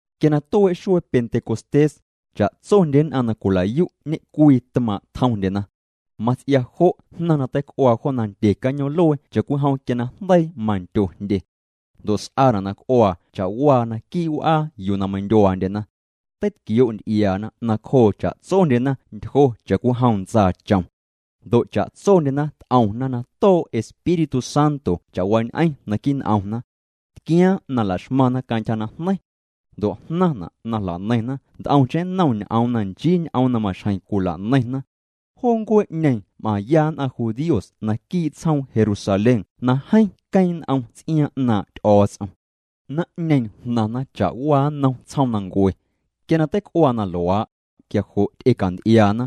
Quia na tuee' xuee Pentecostés, cha'tsondye nn'aⁿ na cwila'yu' ñe'cwii tmaaⁿ' tjomndyena. Mats'ia jo' jnaⁿ na teic'uaa jo nandye cañoom'luee cha'cwijom quia na jndeii mandyo jndye. Ndo' s'aana' na c'uaa cha'waa naquii' w'aa yuu na meindyuaandyena. Teitquioo' nty'iaana nacjoo cha'tsondyena ntyjo cha'cwijom ntsaachom. Ndo' cha'tsondyena t'omna na too' Espíritu Santo cha'waañ'eⁿ naquii' n'omna. Tquiaaⁿ na la'xmaⁿna cantyja najneiⁿ. Ndo' jnaⁿna' na jla'neiⁿna nt'omcheⁿ nnom ñ'oom na nchii ñ'oom na maxjeⁿ cwila'neiⁿna. Joo ncuee'ñeeⁿ m'aⁿya nn'aⁿ judíos naquii' tsjoom Jerusalén na jeeⁿ queeⁿ n'om ts'iaaⁿ 'naaⁿ' Ty'o̱o̱ts'om. Naⁿ'ñeeⁿ jnaⁿna cha'waa nnom tsjoomnancue. Quia na teic'uaa na luaa', quia jo' ty'ecanty'iaana.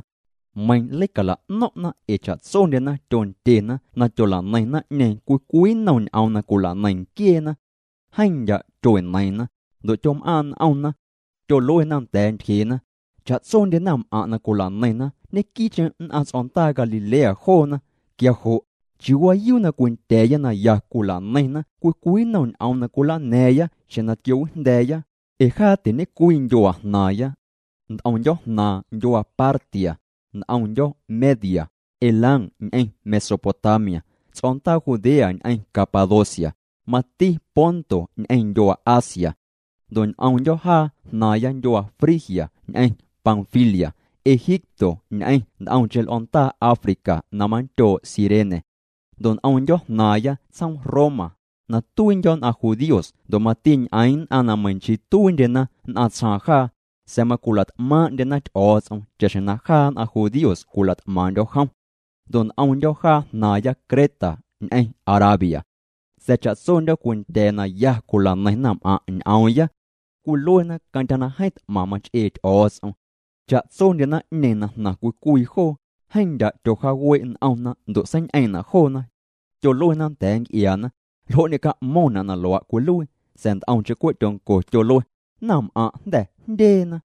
Meiⁿ leicala'no̱ⁿ'na ee cha'tsondyena tyondyena na tyola'neiⁿ naⁿ'ñeeⁿ cwii cwii nnom ñ'oom na cwila'neiⁿ nquieena. Jeeⁿ ndya' tyueneiiⁿna, ndo' tyom'aaⁿ' n'omna. Tyoluena nda̱a̱ ntyjeena: —Cha'tsondye naⁿm'aⁿ' na cwila'neiⁿna ñequii'cheⁿ nn'aⁿ ts'o̱ndaa Galilea joona, quia jo' ¿chiuu waayuu na cwindya̱a̱ya na ya cwila'neiⁿna cwii cwii nnom ñ'oom na cwilana̱a̱ⁿya xjeⁿ na tquiowijnda̱a̱ya? Ee jaa tiñe'cwii ndyuaa jnaaⁿya. Nt'omndyo̱ jnaaⁿ ndyuaa Partia, nt'omndyo̱ Media, Elam ñ'eⁿ Mesopotamia, ts'o̱ndaa Judea ñ'eⁿ Capadocia, mati Ponto ñ'eⁿ ndyuaa Asia. Ndo' nt'omndyo̱ jaa jnaaⁿya ndyuaa Frigia ñ'eⁿ Panfilia, Egipto ñ'eⁿ nt'omcheⁿ l'o̱ndaa África na manndyoo' Cirene. Ndo' nt'omndyo̱ jnaaⁿya tsjoom Roma, na tuiindyo̱ nn'aⁿ judíos ndo' mati ñ'eⁿ nn'aⁿ meiⁿ nchii tuiindyena nn'aⁿ tsjaaⁿ jaa, sa̱a̱ macwila't'maaⁿ'ndyena Ty'o̱o̱ts'om cha'xjeⁿ na jaa nn'aⁿ judíos cwilat'maaⁿ'ndyo̱ jom. Ndo' nt'omndyo̱ jaa jnaaⁿya Creta ñ'eⁿ Arabia. Sa̱a̱ cha'tsondyo̱ cwindya̱a̱ na ya cwila'neiⁿ naⁿm'aaⁿ' ñ'oomya. Cwiluena cantyja na jeeⁿ t'maⁿ mach'ee Ty'o̱o̱ts'om. Cha'tsondye naⁿ'ñeeⁿ na jnaⁿ cwii cwii joo, jeeⁿ ndya' tyojaawee' n'omna ndo' seiñ'eeⁿ'na' joona. Tyoluena nda̱a̱ nc'iaana: —¿Ljo' ñeca'mo̱ⁿna' na luaa' cwiluii? Sa̱a̱ nt'omcheⁿ cwe' tyonco, tyolue: —Naⁿm'aⁿ' jnda̱ jndyeena.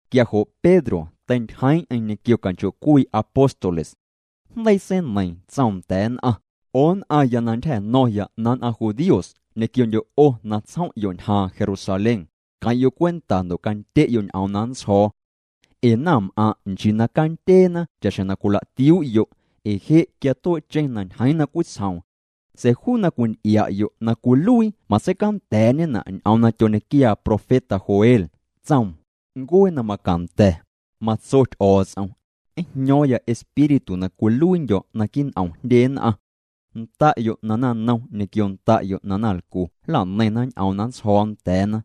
Quia jo' Pedro teintyjeeⁿ'eⁿ ñequio canchoo'cwii apóstoles. Jndeii seineiiⁿ, tsoom nda̱a̱ nn'aⁿ: —'O nn'aⁿya ntyja̱ño̱ⁿya nn'aⁿ judíos ñequiondyo' 'o na tsjom'yo' ñjaaⁿ Jerusalén, queⁿ'yo' cwenta ndo' candye'yo' ñ'oom na nntsjo̱o̱. Ee naⁿm'aⁿ' nchii na candyeena cha'xjeⁿ na cwila'tiuu'yo', ee je' quia tuee'cheⁿ na ñjeeⁿ na cwitsjoom. Sa̱a̱ juu na cwinty'ia'yo' na cwiluii matseicanda̱a̱'ñena' ñ'oom na tyoñequiaa profeta Joel, tsoom: Ncuee na macanda̱, matso Ty'o̱o̱ts'om, njño̱o̱ⁿya Espíritu na cwiluiindyo̱ naquii' n'om jndye nn'aⁿ. Nda'yo' na naⁿnom ñequio nda'yo' na naⁿlcu nla'neiⁿna ñ'oom na nntsjo̱o̱ nda̱a̱na.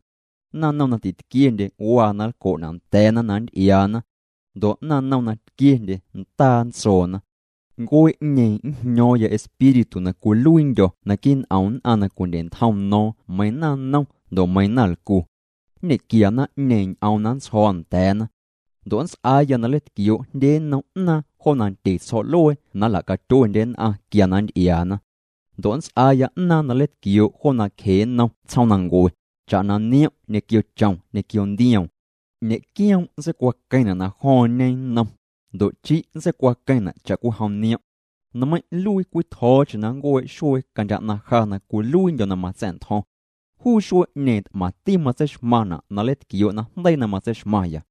Naⁿnom na titquiendye waa na nlco'na' nda̱a̱na na nnty'iaana. Ndo' naⁿnom na tquiendye ndaa nntsoona. Ncuee'ñeeⁿ njño̱o̱ⁿya Espíritu na cwiluiindyo̱ naquii' n'om nn'aⁿ na cwindye'ntjom no̱o̱ⁿ meiiⁿ naⁿnom ndo' meiiⁿ naⁿlcu. Nñequia naⁿ'ñeeⁿ ñ'oom na nntsjo̱o̱ nda̱a̱na. Ndo' nnts'aaya na nleitquioo' jndye nnom 'naaⁿ jo nandye tsjo̱'luee na nla'catyuendye nn'aⁿ quia na nnty'iaana. Ndo' nnts'aaya 'naaⁿ na nleitquioo' jo nacje nnom tsjoomnancue, cha'na niom' ñequio chom ñequio ndioom. Ñe'quioom' nntseicwaqueⁿna' na jo̱o̱ⁿñe nnom, ndo' chi' nntseicwaqueⁿna' cha'cwijom niom'. Nmeiⁿ' nluii cwii tjo̱o̱cheⁿ na nncuee' xuee cantyja 'naⁿ ja na cwiluiindyo̱ na matsa̱'ntjo̱ⁿ. Juu xuee'ñeeⁿ t'maⁿticheⁿ matseixmaⁿna' na nleitquioo' najndeii na matseixmaⁿya.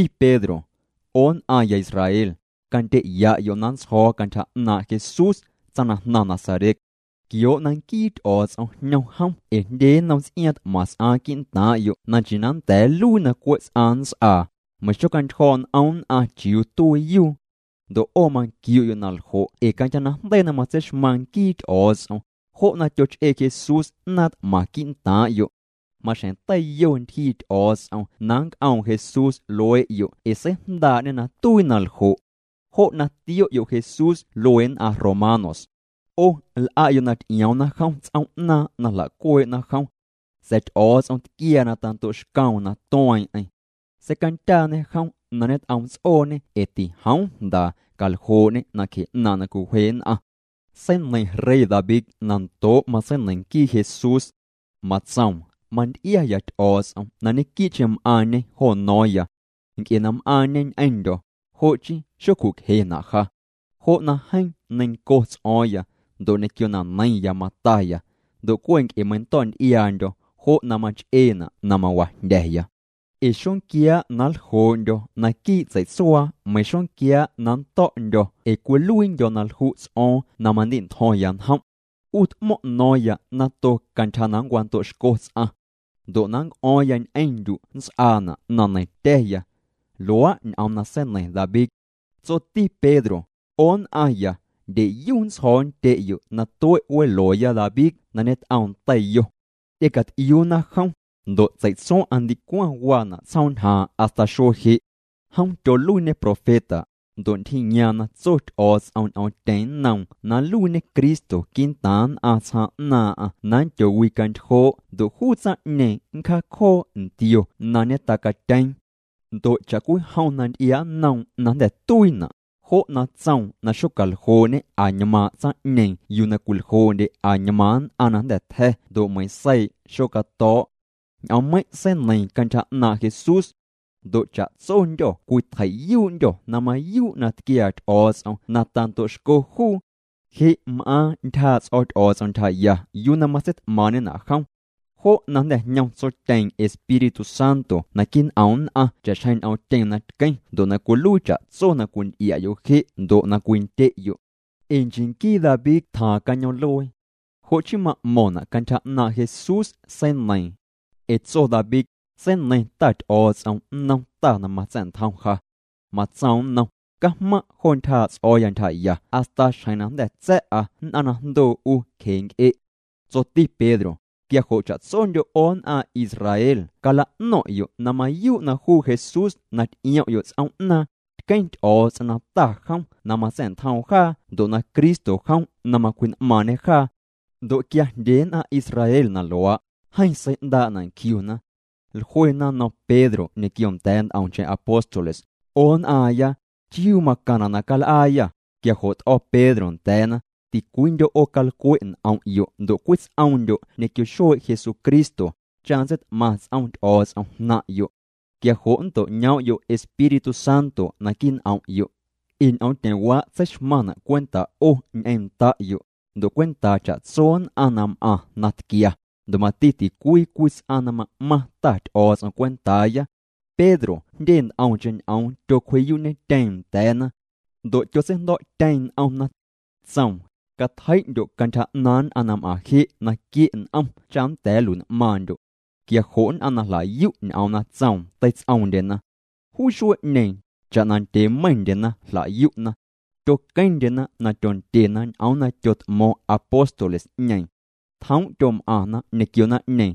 Tsoti Pedro: —'O nn'aⁿya Israel, candyeya'yo' na nntsjo̱o̱ cantyja 'naaⁿ' Jesús tsaⁿ na jnaⁿ Nazaret. Tquioo' na nquii Ty'o̱o̱ts'om jñom jom ee jndye nnom ts'iaaⁿ t'maⁿ s'aaⁿ quii'ntaaⁿ'yo' na nchii na nnda̱a̱ nnluii na cwe' ts'aⁿ nnts'aa, meiⁿ xocjaantyjo̱o̱' n'om nn'aⁿ chiuu tuiiyuu. Ndo' 'o manquiu'yo' na ljo' ee cantyja najndeii na matseixmaⁿ nquii Ty'o̱o̱ts'om, jo' na tyoch'ee Jesús 'naaⁿ t'maⁿ quii'ntaaⁿ'yo'. Maxjeⁿ teiyo ntyjii Ty'o̱o̱ts'om na nnc'oom Jesús luee'yo' ee seijndaa'ñê na tuii na ljo'. Jo' na tio'yo' Jesús luee nn'aⁿ romanos. 'O l'a'yo' na ty'ioomna jom ts'oom'naaⁿ na jlacuee'na jom. Sa̱a̱ Ty'o̱o̱ts'om tquiaa na tando'xcoom na tueeⁿ'eⁿ. Seicandyaañe jom na ñet'omts'ooñê ee tijoom jndaa caljoo'ñê nacje 'naaⁿ' na cwiwje nn'aⁿ. Seineiⁿ rey David na ndoo' matseineiⁿ nquii Jesús. Matsoom: Manty'iaya Ty'o̱o̱ts'om na ñequii'cheⁿ m'aaⁿñê jo no̱o̱ⁿya. Nc'e na m'aaⁿñê ñ'eⁿndyo̱, jo' chii xocju'cjena' ja. Jo' na jeeⁿ neiⁿnco ts'o̱o̱ⁿya, ndo' ñequio na neiⁿya mataya. Ndo' cwe' nc'e meindo̱o̱'nty'iaandyo̱, jo' na mach'eena' na mawajndya̱ya. Ee xonquiaa' na nljoo'ndyo̱ tsei'tsuaa meiⁿ xonquiaa' na nnto̱'ndyo̱ ee cwiluiindyo̱ na lju' ts'o̱o̱ⁿ na mandi'ntjo̱ⁿya njom'. 'U t'mo̱ⁿ' no̱o̱ⁿya nato cantyja na nncwando'xco ts'aⁿ. Ndo' na nnc'o̱o̱ⁿya ñ'eⁿndyu' nnts'aana' na neiⁿtya̱ya. Luaa' ñ'oom na seineiⁿ David. Tsoti Pedro: —'O nn'aⁿya, ndyeyu nntsjo̱o̱ nndye'yo' na tue' welooya David na ñet'oom teiyo. Ty'ecat'iuuna jom, ndo' tsei'tsuaⁿ'aⁿ ndicwaⁿ waana' tsjoom ñjaaⁿ hasta xuee je'. Jom tyoluiiñê profeta, ndo' ntyjiiyaaⁿ na tso Ty'o̱o̱ts'om ñ'oomtyeⁿ nnoom na nluiiñe Cristo quii'ntaaⁿ nn'aⁿ tsjaaⁿ 'naaⁿ'aⁿ na nndyowicantyjoo' ndo' juu tsaⁿ'ñeeⁿ nncjaacjoo ntio na ñetacatyeeⁿ. Ndo' cha'cwijom na nnty'iaa' nnoom najnda̱ tuiina', jo' na tsoom na xocaljoo'ñe añmaaⁿ' yuu na cwiljoo'ndye añmaaⁿ nn'aⁿ na jnda̱ tja̱ ndo' meiⁿ seii' xocato̱o̱'. Ñ'oommeiⁿ' seineiiⁿ cantyja 'naaⁿ' Jesús. Ndo' cha'tsondyô̱ cwitjei'yuu'ndyô̱ na mayuu' na tquiaa Ty'o̱o̱ts'om na tando'xco juu. Je' m'aaⁿ ntyjaa' ts'o̱ Ty'o̱o̱ts'om ntyjaya yuu na matseit'maaⁿ'ñena' jom. Jo' na jnda̱ jñom Tsotyeeⁿ Espíritu Santo naquii' n'om nn'aⁿ cha'xjeⁿ ñ'oomtyeⁿ na tqueⁿ ndo' na cwiluii cha'tso na cwinty'ia'yo' je' ndo' na cwindye'yo'. Ee nchii nquii David tja cañoom'luee. Jo' chii ma'mo̱ⁿna' cantyja 'naaⁿ' Jesús seneiiⁿ. Ee tso David: Seineiⁿ Ta Ty'o̱o̱ts'om nnom Ta na matsa̱'ntjom ja. Matsoom nnom: “Cajmaⁿ' jo ntyjaa' ts'o̱o̱ya ntyjaya hasta xjeⁿ na jnda̱ tsa̱'a nn'aⁿ na jndoo 'u cjee' nc'e'.” Tsoti Pedro: —Quia jo' cha'tsondyo' 'o nn'aⁿ Israel cala'no̱ⁿ'yo' na mayuu' na juu Jesús na ty'iom'yo' ts'oom'naaⁿ, tqueⁿ Ty'o̱o̱ts'om na Ta jom na matsa̱'ntjoom jaa ndo' na Cristo jom na macwji'n'maaⁿñê jaa. Ndo' quia jndye nn'aⁿ Israel na luaa', jeeⁿ sei'ndaa'na' nquiuna. Jluena nnom Pedro ñequio nda̱a̱ nt'omcheⁿ apóstoles: —'O nn'aaⁿya, ¿chiuu macaⁿna' na cal'aayâ? Quia jo' t'o̱ Pedro nda̱a̱na: —Ticwiindyo' 'o calcwe' n'om'yo' ndo' cwits'oomndyo' ñequio xuee' Jesucristo, cha nntseit'maⁿ ts'om Ty'o̱o̱ts'om jnaⁿ'yo'. Quia jo' nnto'ñoom'yo' Espíritu Santo naquii' n'om'yo'. Ee ñ'oomtyeⁿwaa' tseixmaⁿna' cwenta' 'o ñ'eⁿ nda'yo', ndo' cwentaa cha'tso nn'aⁿ na m'aⁿ na tquia, ndo' mati ticwii cwii ts'aⁿ na ma'maⁿ Ta Ty'o̱o̱ts'om cwentaaya. Pedro jndye nt'omcheⁿ ñ'oom tyocwji'yuu'ñetyeeⁿ nda̱a̱na. Ndo' tyotseijndo̱'tyeeⁿ n'omna. Tsoom: —Catjei'ndyo' cantyja 'naaⁿ nn'aⁿ na m'aⁿ je' na quie' n'om cha nnda̱a̱ nlui'n'maaⁿndyo'. Quia jo' nn'aⁿ na jla'yu' ñ'oom na tsoom teits'oomndyena. Juu xuee'ñeeⁿ, cha'na ndyee meiⁿndyena jla'yu'na. Tyoqueⁿndyena na tyondyena ñ'oom na tyot'mo̱o̱ⁿ apóstoles'ñeeⁿ. Tjoom' tyom'aⁿna ñequio naⁿ'ñeeⁿ.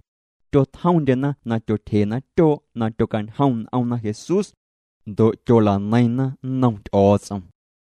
Tyotjomndyena na tyotyjena tyoo' na tyocañjom n'omna Jesús. Ndo' tyola'neiⁿna nnom Ty'o̱o̱ts'om.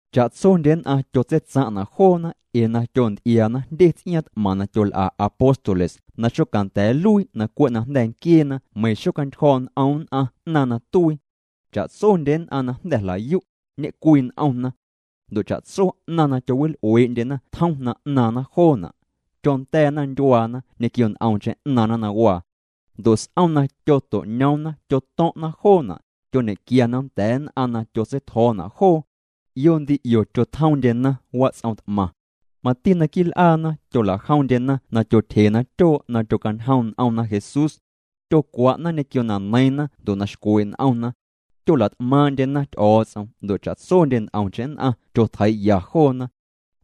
Cha'tsondye nn'aⁿ tyotseitsaⁿ'na' joona ee na tyonty'iaana jndye ts'iaaⁿ t'maⁿ na tyol'a apóstoles na xocanda̱a̱ nluii na cwe' na jnda̱ nquieena meiⁿ xocjaantyjo̱o̱' n'om nn'aⁿ 'naaⁿ na tuii. Cha'tsondye nn'aⁿ na jnda̱ jla'yu', ñe'cwii n'omna. Ndo' cha'tso 'naⁿ na tyowil'uee'ndyena tjom na 'naaⁿna joona'. Tyonda̱a̱na ndyuaana ñequio nt'omcheⁿ 'naaⁿna na waa. Ndo' s'om na tyoto'ñoomna tyoto̱ⁿ'na joona', tyoñequiana nda̱a̱ nn'aⁿ na tyotseitjo̱o̱na' joo. 'Io ndi 'io tyotjomndyena wats'om t'maⁿ. Mati naquii' l'aana tyola'jomndyena na tyotyjena tyoo' na tyocañjom n'omna Jesús. Tyocwa'na ñequio na neiiⁿna ndo' na xcwee' n'omna. Tyola't'maaⁿ'ndyena Ty'o̱o̱ts'om ndo' cha'tsondye nt'omcheⁿ nn'aⁿ tyotjeii'ya joona.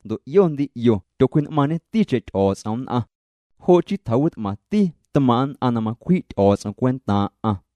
Ndo' 'io ndi 'io tyocwji'n'maaⁿñeticheⁿ Ty'o̱o̱ts'om nn'aⁿ. Jo' chii tjawit'maⁿti tmaaⁿ' nn'aⁿ na macwji' Ty'o̱o̱ts'om cwentaaⁿ'aⁿ.